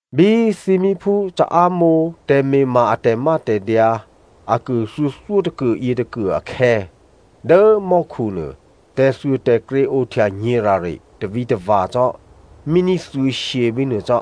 Bí thímíphú caámǒ tè̤me̤ma a tè̤mátè̤dyǎ akuô thuô̌thyótôkuô yětôkuô akhè̌, dố mò́khu nuô, tè̤thuôtè̤krě ohtya nyě̤ rare tavǐtava̤ cò́ míní thuô̌shyě bínuô cò́.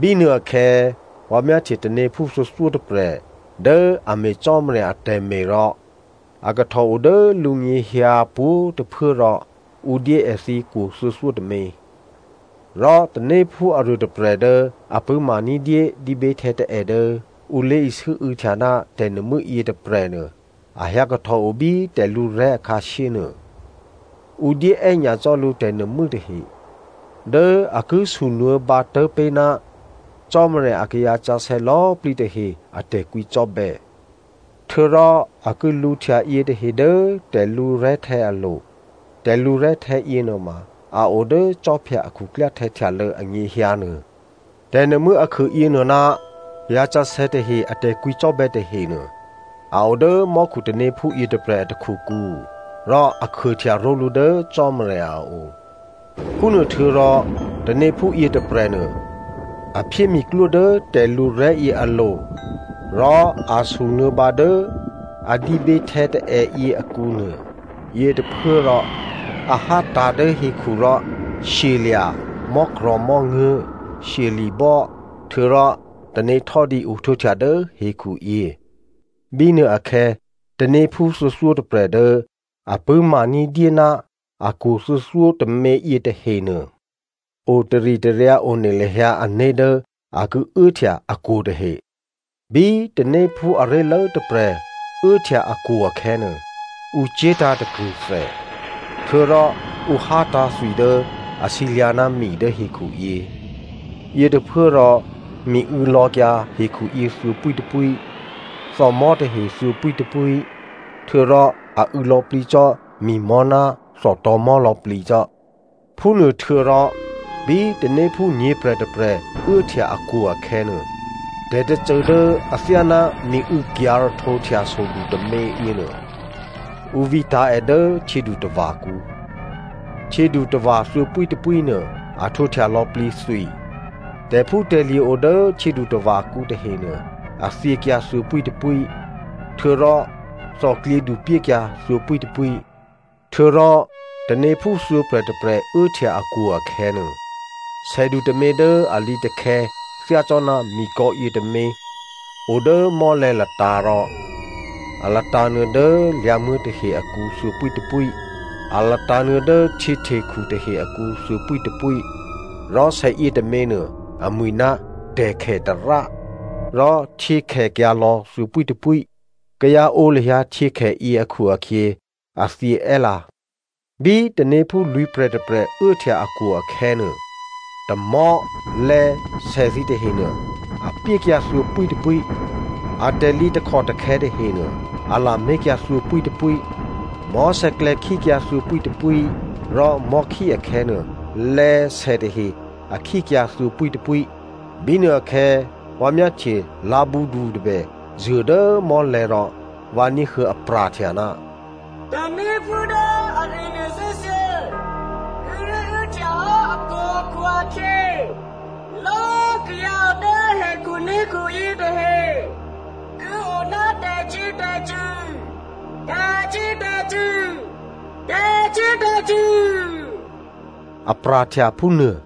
Bínuôakhè̌ vǎ myáhtye tanéphú thuô̌thyótôprè̤ dố a me̤ Cò́marya atè̤me̤ rò a kahtò o dố lǔnyěhyǎ pwǒ̤꤮ tôphuố, rò ǔ dyé èthǐ kwo̤ thuô̌thyótômě. Rò tanéphú aruôtôprè̤ dố a pṳ̂́ma ní̤dyé dǐběhtè̌taè̌ dố ǔ lé̤isû́û̌htya ná tè̤nuô̤mû́ yětôprè̤nuô, a hyǎkahtòo bí tè̤lǔrè̤́ akhǎshyé nuô. Ǔ dyé è́nyacò́ lǔ tè̤nuô̤mû́ tahe dố a ki sunuô̌bǎ tố̤ pé̤ ná Cò́marya akayǎ sǎsè̌ lò̌꤮ plǐ tahe a tè̤kwǐcò́bè̌. Htuô̌rò a ki lǔhtya yětahe dố tè̤lǔrè̤́htè̌ alo̤. Tè̤lǔrè̤́htè̌ yěnuôma a o dố khwí a khuklyáhtè̌ htyalô̌ anyěhyǎ nuô. Tè̤nuô̤mû́ akhuô yěnuô ná kayǎsǎsè̌ tahe a tè̤kwǐcò́bè̌ tahenuô, a o dố mò́khutanéphú yětôprè̤ a takhukǔ rò a khuôhtya ró̤lǔ dố Cò́marya a o. Phúnuôhtuô̌rò tanéphú yětôprè̤nuô, a phyé miklwó dố tè̤lǔrè̤́yě alo̤ rò a sunuô̌bǎ dố lé̤isû́û̌ tè̤nuô̤mû́ a dǐběhtè̌taè̌ yě akǔ nuô. Yětôphuốrò a hátǎ̤ dố hekhu rò shyelya̤, mò́krò̤̌mò́nguố̤, shyeli̤bò́ htuô̌rò tanéhtò́dǐ ohtwǒhtya dố hekhuyě. Bínuôakhè̌ tanéphú thuô̌thyótôprè̤. Dố a pṳ̂́maní̤dyé ná akwo̤ thuô̌thyótômě yětahenuô o taritaryǎ one lahyǎ ané̤ dố a ki uốhtya akwo̤ tahe. Bí tanéphú aré̤lố tôprè̤ uốhtya akwo̤ akhè̌nuô, ǔ cye̤tǎ̤ takrṳ̂thè. Htuô̌rò ǔ hátǎ̤ thwi dố a sǐlyǎ̤ ná mi dố hekhuyě. Yětôphuốrò mi û̌lò̌kyǎ hekhuyě thuô̌pwítôpwí, thòmò̤́ tahe thuô̌pwítôpwí, htuô̌rò a û̌ lò̌plǐ cò́ mi̤mò̤́ ná thòtò̤̌mò̤́ lò̌꤮ plǐcò́. Phúnuôhtuô̌rò bí tanéphú nyě̤prè̤ tôprè̤ uốhtya akwo̤ akhè̌nuô, tè̤tôcô dố athyáná miû̌kyǎ̤ rahtǒhtya sodu tômě yěnuô ǔ vǐtǎ̤ è dố htyědutava̤kǔ. Htyědutava̤ thuô̌pwítôpwí nuô a htwǒhtya lò̌plǐ thwi. Tè̤phútè̤lye̤ o dố htyědutava̤kǔ tahenuô, a thyěkyǎ thuô̌pwítôpwí, htuô̌rò thòklyědu pyékyǎ thuô̌pwítôpwí. Htuô̌rò tanéphú thuô̌prè̤ tôprè̤ uốhtya akwo̤ akhè̌nuô, sèdu tômě dố a lǐtakhè̌ thyácò́ná mikò̌ yětômě o dố mò́lè̤̌ latǎ̤ rò a latǎ̤nuô̌ dố lyǎ̤muố̤ tahe akǔ thuô̌pwítôpwí, a latǎ̤nuô̌ dố htyěhtekhu tahe akǔ thuô̌pwítôpwí. Rò sè yětômě nuô, amwi̤ ná “Phǒkhèmò̤́,” rò htyě khèkyǎ lò̌ thuô̌pwítôpwí. Kayǎ ǒ lahyǎ htyěkhèyě akhu-akhyě a thyě è́lǎ. Bí tanéphú lwǐ̤prè̤ tôprè̤ uốhtya akwo̤ akhè̌nuô, tamò̤́, lè̌, sè thǐ tahenuô, a pyékyǎ thuô̌pwítôpwí. Atè̤lǐ takhòtakhè̌ tahenuô, a lamé̤kyǎ thuô̌pwítôpwí. Mò̤́sè̌klè̌ khíkyǎ thuô̌pwítôpwí, rò mò̤́khí akhè̌nuô, lè̌, sè tahe a khíkyǎ thuô̌pwítôpwí. Bínuôakhè̌ vǎ myáhtye lǎ̤bǔdu tôbè zuô̤ dố mò́lè̤̌ rò vǎ ní̤huô̌ apra̤htya, “Tanéphú dố aruô nuô thè́thuô̌ kíré̤ uốhtya hò́ akwo̤ akhu-akhyě, lò̌꤮ kayǎ o dố hekhuné̤khu yětahe ki o ná tè̤cyě̤tè̤cṳ̂, tè̤cyě̤tè̤cṳ̂, tè̤cyě̤tè̤cṳ̂,” a pra̤htya phúnuô.